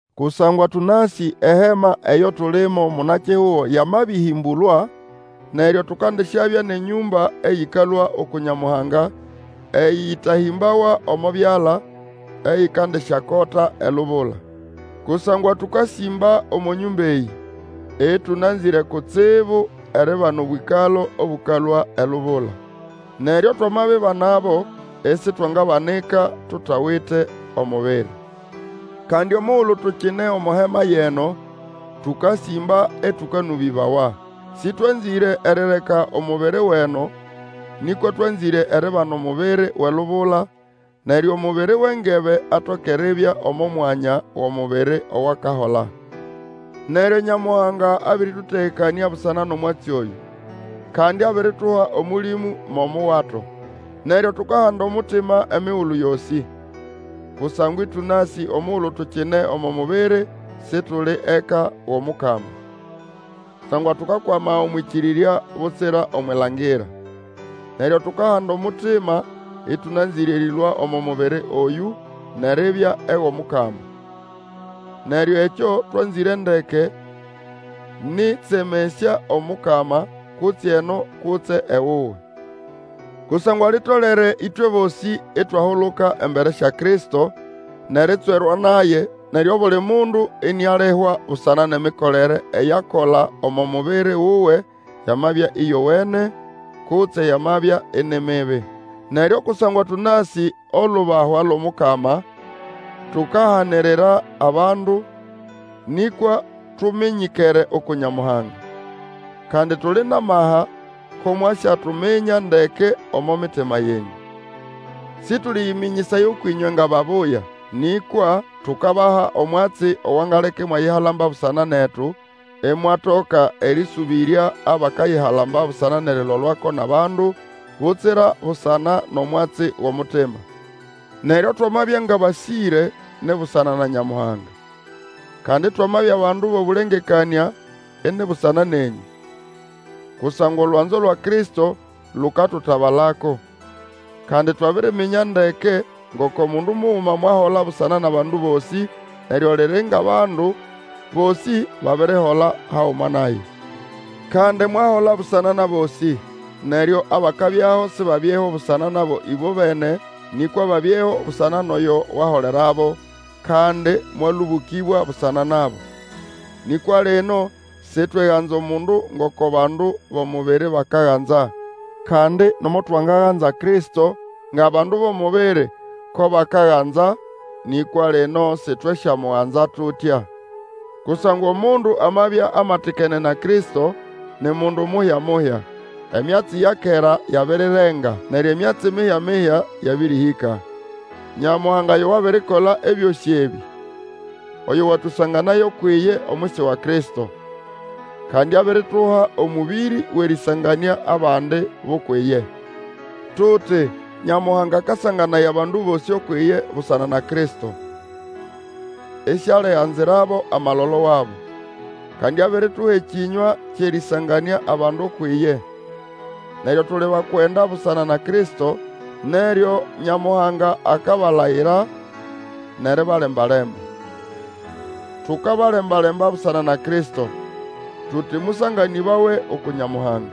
Kusangwa tũnasĩ ehema eyo tulimo, muna-kihugo yamabĩhĩmbũlwa, neryo tukandisyabya nʼenyũmba eyĩkalũa uku Nyamuhanga, eyĩtahĩmbawa omo byala, eyikandisyakota elubula. Kusangwa tũkasĩmba omo nyũmba eyĩ, ĩtũnanzĩre kutsibu eribana obwĩkalo obũkalũa elubula. Neryo twamabibanabo isitwangabanika tutawite omubiri. Kandi omugulu tukine omo hema yʼeno, tũkasĩmba ĩtũkanũbĩbawa. Sĩtwanzĩre erireka omubiri wʼeno, nĩkwa twanzĩre eribana omubiri wʼelubula, neryo omubiri wʼengebe atoke eribya omo mwanya wʼomubiri owakahola. Neryo Nyamuhanga abĩrĩtũtegekanĩa busana nʼomwatsi oyũ, kandi abirituha Omũlĩmũ mo omuwato. Neryo tukahanda omutima emigulu yosĩ. Kusangwa ĩtũnasĩ omugulu tukine omo mubiri Situli eka wʼOmukama. Kusangwa tukakwama omwʼĩkĩrĩrya, butsira omwʼilangira. Neryo tukahanda omutima, ĩtũnanzĩre erĩlũa omo mubiri oyũ, nʼeribya ewʼOmukama. Neryo ekyo twanzĩre ndeke nĩ ʼtsemesya Omukama, kutse eno, kutse ewuwe. Kusangwa litolere ĩtwe bosĩ itwahuluka embere sya Kristo nʼeritswerwa naye, neryo obuli mundu inialihwa busana nʼemikolere eyo akola omo mubiri wuwe, yamabya ĩyowene, kutse yamabya ini mibi. Neryo kusangwa tũnasĩ olubahwa lwʼOmukama, tukahanirira abandu, nĩkwa tuminyikere uku Nyamuhanga; kandi tuli nʼamaha ko mwasyatuminya ndeke omo mitima yenyũ. Sĩtũlĩyĩmĩnyĩsaya ũkwʼĩnywe nga babuya, nĩkwa tukabaha omwatsi owangaleka imwayihalamba busana netu, imwatoka erĩsũbĩrya abakayihalamba busana nʼerilolwako nʼabandu butsira busana nʼomwatsi wʼomutima. Neryo twamabya ngʼabasĩre, ni busana na Nyamuhanga; kandi twamabya bandu bʼobũlengekanĩa, ini busana nenyũ. Kusangwa olwanzo lwa Kristo lukatutabalako, kandi twabiriminya ndeke ngoko mundu muguma mwahola busana nʼabandu bosĩ, neryo liri ngʼabandu bosĩ babirihola haguma naye. Kandi mwahola busana nʼabosĩ, neryo abakabyaho sibabyeho busana nabo ĩbobene, nĩkwa babyeho busana nʼoyo waholerabo, kandi mwalũbũkĩbwa busana nabo. Nĩkwa lino sitweganza omundu ngoko bandu bʼomubiri bakaganza. Kandi nomo twangaganza Kristo ngʼabandu bʼomubiri ko bakaganza, nĩkwa lino sitwesyamuganza tutya. Kusangwa omundu amabya amatikene na Kristo, ni mundu muhya-muhya; emyatsi ya kera yabirirenga, neryo emyatsi mihya-mihya yabĩrĩhĩka. Nyamuhanga yo wabirikola ebyosĩ ebĩ, oyo watũsanganaya ukwʼiye omwisi wa Kristo, kandi abirituha omũbĩrĩ wʼerĩsanganĩa abandi bʼukwʼiye. Tuti, Nyamuhanga akasanganaya bandu bosĩ ukwʼiye busana na Kristo, isialiganzirabo amalolo wabo. Kandi abirituha ekĩnywa kyʼerĩsanganĩa abandu ukwʼiye. Neryo tuli bakwenda busana na Kristo, neryo Nyamuhanga akabalayira nʼeribalemba-lemba. Tukabalembalemba busana na Kristo, tuti, Mũsanganĩbawe uku Nyamuhanga,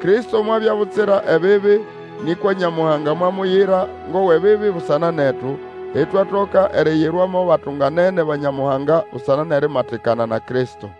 Kristo mwabya butsira ebibi, nĩkwa Nyamuhanga mwamuyira ngʼowʼebibi busana netu, itwatoka eriyirwa mo batunganene ba Nyamuhanga busana nʼerimatikana na Kristo.